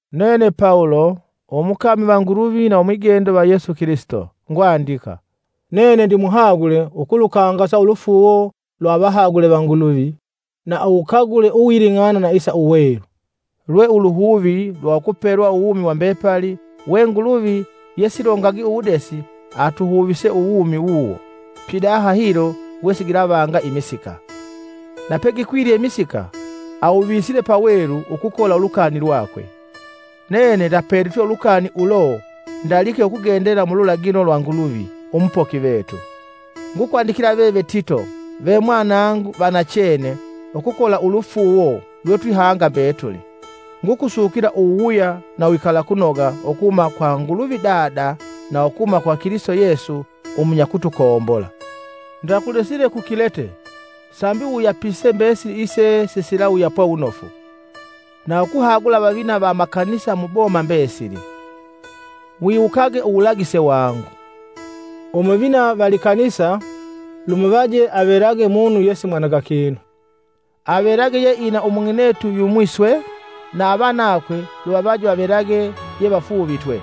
Nene Pawulo, umukami va Nguluvi na umwigendo va Yesu Kilisito, ngwandika. Nene ndimuhagule ukulukangasa ulufuuwo lwa avahagule va Nguluvi na uwukagule uwuling'ana na isa uwelu, lwe uluhuvi lwa ukupelwa uwumi wa mbepali we Nguluvi yesilongagi uwudesi, atuhuvise uwumi wuwo, pidaha hilo wesigilavanga imisika, na pegikwilye imisika, awuvisile pawelu ukukola ulukani lwakwe. Nene ndapelitwe ulukani ulo ndalike ukugendela mululagilo lwa Nguluvi, umupoki vetu. Ngukwandikila veve Tito ve mwanangu va nachene ukukola ulufuuwo lwetwihanga mbetuli. Ngukusukila uwuwuya na uwikalakunoga ukuhuma kwa Nguluvi Dada, na ukuhuma kwa Kilisito Yesu, umunyakutukombola. Ndakulesile ku Kilete sambi uwuyapise mbesili ise sisilawuyapwa wunofu, na ukuhagula avavina va amakanisa mu boma mbesili: Wiwukage uwulagise wangu. Umuvina va likanisa lumuvaje avelage munu yesimwananga kinu, avelage yeina umung'inetu yumwi swe, na avanakwe luvavaje vavelage yevafuuvitwe,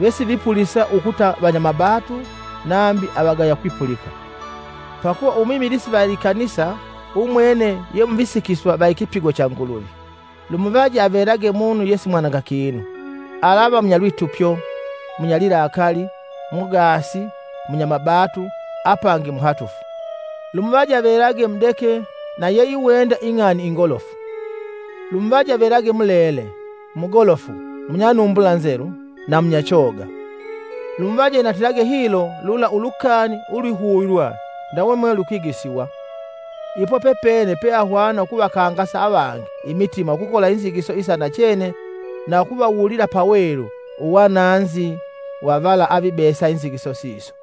vesivipulisa ukuta vanyamabatu nambi avagaya kwipulika. Pakuva umwimilisi va likanisa umwene ye muvisikisiwa va ikipigo cha Nguluvi, lumuvaje avelage munu yesimwananga kinu. Alava munyalwitupyo, munyalilakali, mugaasi, munyamabatu apangi muhatufu, Lumuvaje avelage mudeke na yeiwenda ing'ani ingolofu. Lumuvaje avelage mulele, mugolofu, munyanumbula nzelu, na munyachoga. Lumuvaje inatilage hilo lula ulukani ulwihuvilwa ndawe mwe lukwigwisiwa. Ipo pepene peahwana ukuvakangasa avangi imitima ukukola inzigiso isa nachene na ukuvawulila pawelu uwananzi wa vala avibesa inzigiso siso.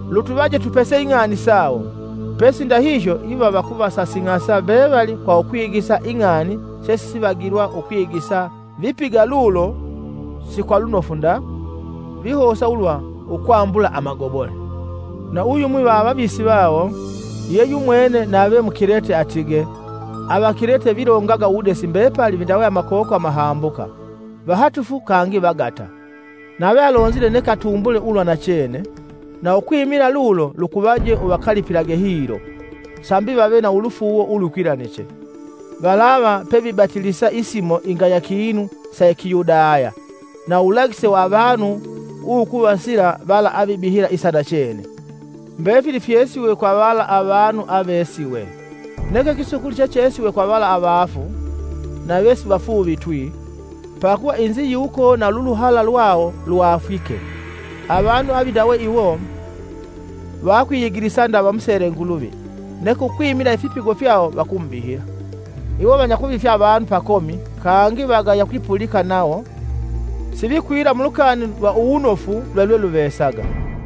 Lutuvaje tupese ing'ani sawo, pesi ndahihyo iva vakuvasasing'asa mbevali kwa ukwigisa ing'ani sesivivagilwa ukwigisa vipiga lulo si kwa lunofu nda, vihosa ulwa ukwambula amagobole. Na uyumwi va avavisi vawo, ye yumwene nave Mukilete, atige, “Avakilete vilongaga uwudesi mbepali vindawe amakoko amahambuka, vahatufu kangi vagata!” Nave alonzile neke atumbule ulwa nachene, na ukwimila lulo lukuvaje uvakalipilage hilo, sambi vave na ulufuuwo ulukwilaniche. Valava pevibatilisa isimo ingaya kinu sa Kiyudaya na uwulagise wa avanu uwukuvasila vala avibihila isa nachene. Mbefili fyesiwe kwa vala avanu avevesiwe; neke kisukuli chechesiwe kwa vala avaafu na vesivafuuvitwi, pakuva inziyiwuko na luluhala lwawo lwaafwike. Avanu avindawe iwo vakwiyigilisa nda vamusele Nguluvi neke ukwimila ifipigo fyawo vakumubihila. Iwo vanyakuvifya avanu pakomi kangi vagaya kwipulika nawo sivikwila mulukani lwa uwunofu lwelweluvesaga.